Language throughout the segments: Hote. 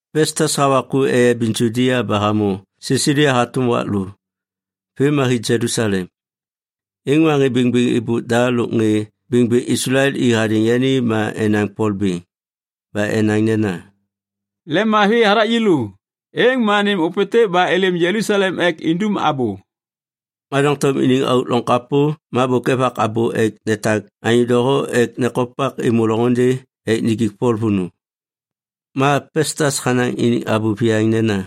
Pestas hawa ku eyabiŋ Judia ba hamô Sisalia hatôm wak lô. Vêm ma hi Jelusalem. Êŋ ma ŋê bêŋbêŋ êbôk da lôk ŋê bêŋbêŋ Islael i hadêŋ yani ma enaŋ Pol bêŋ. Ba enaŋ nena, “Lemmavi hathak yêlô, êŋ ma nêm ôpêntêk ba êlêm Jelusalem ek indum abô.” Ma doŋtom iniŋ auk loŋ kapô ma bôk evak abô ek netak anyô doho ek nekopak êmô loŋôndê ek nijik Pol vônô. Ma Pestas hanaŋ iniŋ abô viyaŋ nena,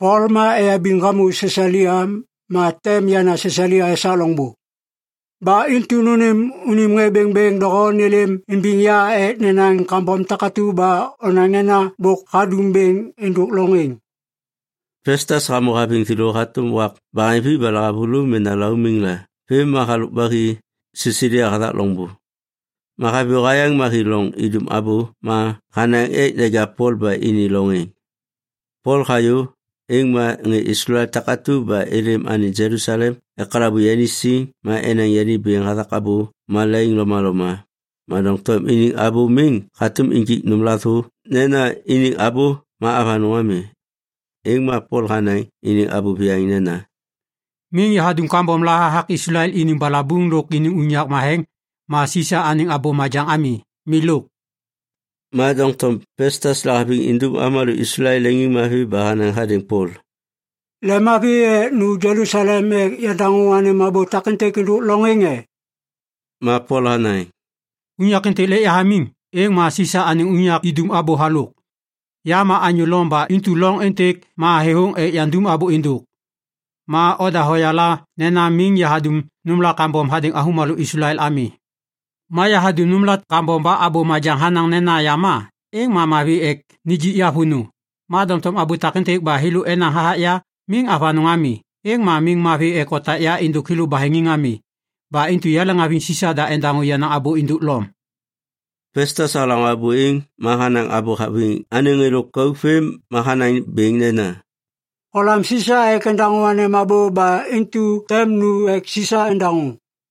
“Pol ma eyabiŋ hamô Sisalia. Ma tem yana Sisalia esak loŋbô. Ba intu nônêm unim ŋê bêŋbêŋ doho nêlêm imbiŋ ya ek nenaŋ kambom takatu ba onaŋ nena bôk hadum bêŋ êndôk loŋ êŋ.” Pestas hamô haviŋ thêlô hatôm wak baheŋvi ba lahavulô mena laumiŋ la vêm ma halôk ba hi Sisalia hathak loŋbô. Ma haviyô hayaŋ ma hi loŋ idum abô ma hanaŋ ek neja Pol ba ini loŋ êŋ. Pol hayô, êŋ ma ŋê Islael takatu ba êlêm anêŋ Jelusalem ekalabu yani siŋ ma enaŋ yani bêŋ hathak abô malaiŋ lomaloma, ma doŋtom iniŋ abô miŋ hatôm injik nômla thô nena iniŋ abô ma avanôŋ ami. Êŋ ma Pol hanaŋ iniŋ abô viyaŋ nena, “Miŋ yahadum kambom la hathak Islael iniŋ balabuŋ lôk iniŋ unyak matheŋ ma Sisa anêŋ abô majaŋ ami. Milôk.” Ma doŋtom Pestas lahaviŋ indum avômalô Islael leŋiŋmavi ba hanaŋ hadêŋ Pol, “Lemmavi ek nu Jelusalem ek yandaŋô anêm abô takêntêk êndôk loŋ êŋ e?” Ma Pol hanaŋ, “Unyak êntêk lêk yahamiŋ, êŋ ma Sisa anêŋ unyak idum abô halôk. Ya ma anyô Lom ba intu loŋ êntêk ma thêthôŋ ek yandum abô êndôk. Ma oda hoyala nena miŋ yahadum nômla kambom hadêŋ avômalô Islael ami. Ma yahadum nômla kambom ba abô majaŋ hanaŋ nena yama, êŋ ma mavi ek nijik ya vônô. Ma doŋtom abô takêntêk ba thêlô enaŋ hathak ya miŋ avanôŋ ami, êŋ ma miŋ mavi ek otak ya êndôk thêlô baheŋiŋ ami. Ba intu yaleŋhaviŋ Sisa da endaŋô yenaŋ abô êndôk Lom.” Pestas halaŋô abô êŋ ma hanaŋ abô haviŋ anêŋ ŋê lôkauk vêm ma hanaŋ bêŋ nena, “Holam Sisa ek endaŋô anêm abô ba intu tem nu ek Sisa endaŋô.”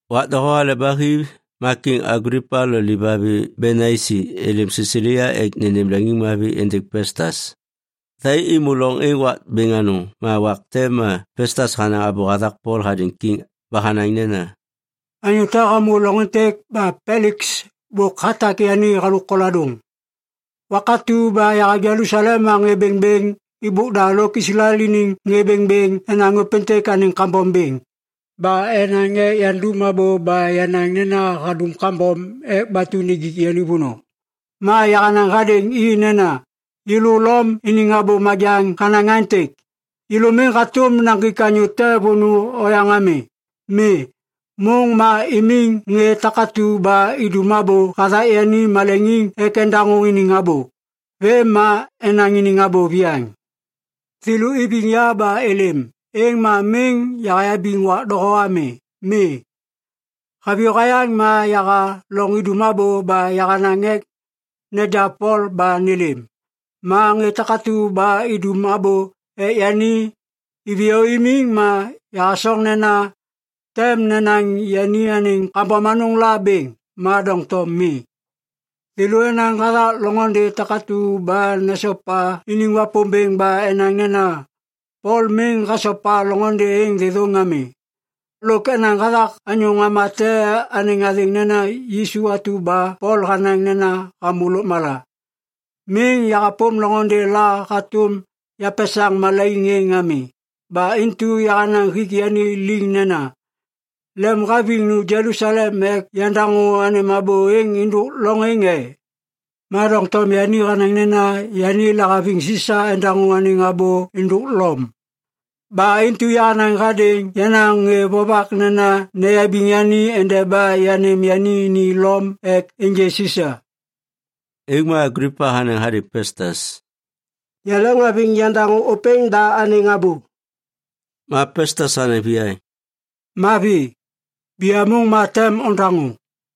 Wak doho hale ba hi ma Kiŋ Aglipa lo livavi Benaisi êlêm Sisalia ek nênêm leŋiŋmavi êndêŋ Pestas. Thai êmô loŋ êŋ wak bêŋ anôŋ ma wak te ma Pestas hanaŋ abô hathak Pol hadêŋ kiŋ ba hanaŋ nena, “Anyô te hamô loŋ êntêk ba Peliks bôk hatak yani halôk koladôŋ. Wak atu ba yaha Jelusalem ma ŋê bêŋbêŋ êbôk da lôk Islael iniŋ ŋê bêŋbêŋ enaŋ ôpêntêk anêŋ kambom bêŋ, ba enaŋ ek yandum abô ba yanaŋ nena hadum kambom ek batu nijik yani vônô. Ma yahanaŋ hadêŋ i nena, ‘Yêlô Lom iniŋ abô majaŋ hanaŋ aêntêk, yêlô miŋ hatôm naŋgik anyô te vônô oyaŋ ami. Mi, môŋ ma imiŋ ŋê takatu ba idum abô hathak yani maleŋiŋ ek endaŋô iniŋ abô. Vêm ma enaŋ iniŋ abô viyaŋ.’ Thêlô iviŋ ya ba êlêm, êŋ ma miŋ yahayabiŋ wak doho ami. Mi, haviyô hayaŋ ma yaha loŋ idum abô ba yahanaŋ ek neja Pol ba nêlêm. Ma ŋê takatu ba idum abô ek yani iviyô imiŋ ma yahasoŋ nena tem nenaŋ yani anêŋ kambom anôŋ la bêŋ, ma doŋtom mi. Thêlô enaŋ hathak loŋôndê takatu ba nesopa iniŋ Wapômbêŋ ba enaŋ nena Pol miŋ hasopa loŋôndê êŋ thêthôŋ ami. Lôk enaŋ hathak anyô ŋama te anêŋ athêŋ nena Yisu atu ba Pol hanaŋ nena hamô lôkmala. Miŋ yahapôm loŋôndê la hatôm yapesaŋ malaiŋ êŋ ami. Ba intu yahanaŋ hik yani liŋ nena, ‘Lemhaviŋ nu Jelusalem ek yandaŋô anêm abô êŋ êndôk loŋ êŋ e?’ Ma doŋtom yani hanaŋ nena yani lahaviŋ Sisa endaŋô anêŋ abô êndôk Lom. Ba intu yahanaŋ hadêŋ yenaŋ ŋê vovak nena neyabiŋ yani endeba yanêm yani ni Lom ek ênjê Sisa.” Êŋ ma Aglipa hanaŋ hadêŋ Pestas, “Yaleŋhaviŋ yandaŋô ôpêŋ da anêŋ abô.” Ma Pestas hanaŋ viyaŋ, “Mavi, biyamôŋ ma tem ondaŋô.”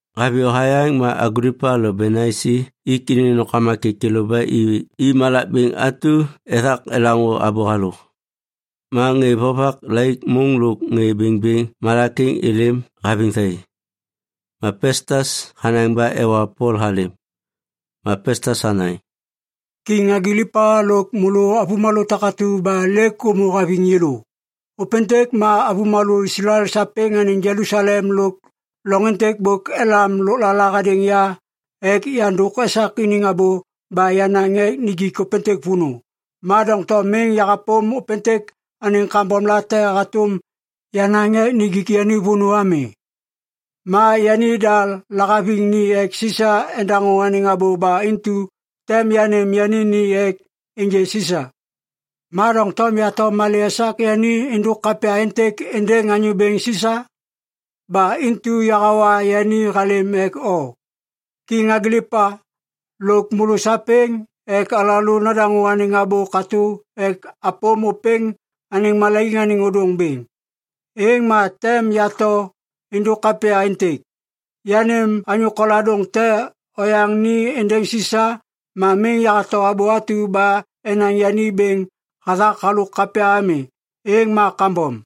Haviyô hayaŋ ma Aglipa lo Benaisi ik iniŋ nômkama kêkêlô ba i malak bêŋ atu ethak elaŋô abô halôk. Ma ŋê vovak laik môŋ lôk ŋê bêŋbêŋ malak êŋ êlêm haviŋ thai. Ma Pestas hanaŋ ba ewa Pol halêm. Ma Pestas hanaŋ, “Kiŋ Aglipa lôk môlô avômalô takatu ba lêk ômô haviŋ yêlô. Ôpêntêk ma avômalô Islael sapêŋ anêŋ Jelusalem lôk loŋ êntêk bôk elam lôklala hadêŋ ya ek yandôk esak iniŋ abô ba yanaŋ ek nijik ôpêntêk vônô. Ma doŋtom miŋ yahapôm ôpêntêk anêŋ kambomlate hatôm yanaŋ ek nijik yani vônô ami. Ma yanida lahaviŋ ni ek Sisa endaŋô anêŋ abô ba intu tem yanêm yani ni ek ênjê Sisa. Ma doŋtom yato malê esak yani êndôk kapya êntêk êndêŋ anyô bêŋ Sisa? Ba intu yahawa yani halêm ek o, Kiŋ Aglipa, lôk môlô sapêŋ ek alalô nadaŋô anêŋ abô katô ek apôm ôpêŋ anêŋ malaiŋ anêŋ ôdôŋ bêŋ, êŋ ma tem yato êndôk kapya êntêk. Yanêm anyô koladôŋ te oyaŋ ni êndêŋ Sisa ma miŋ yahato abô atu ba enaŋ yani bêŋ hathak halôk kapya ami, êŋ ma kambom.”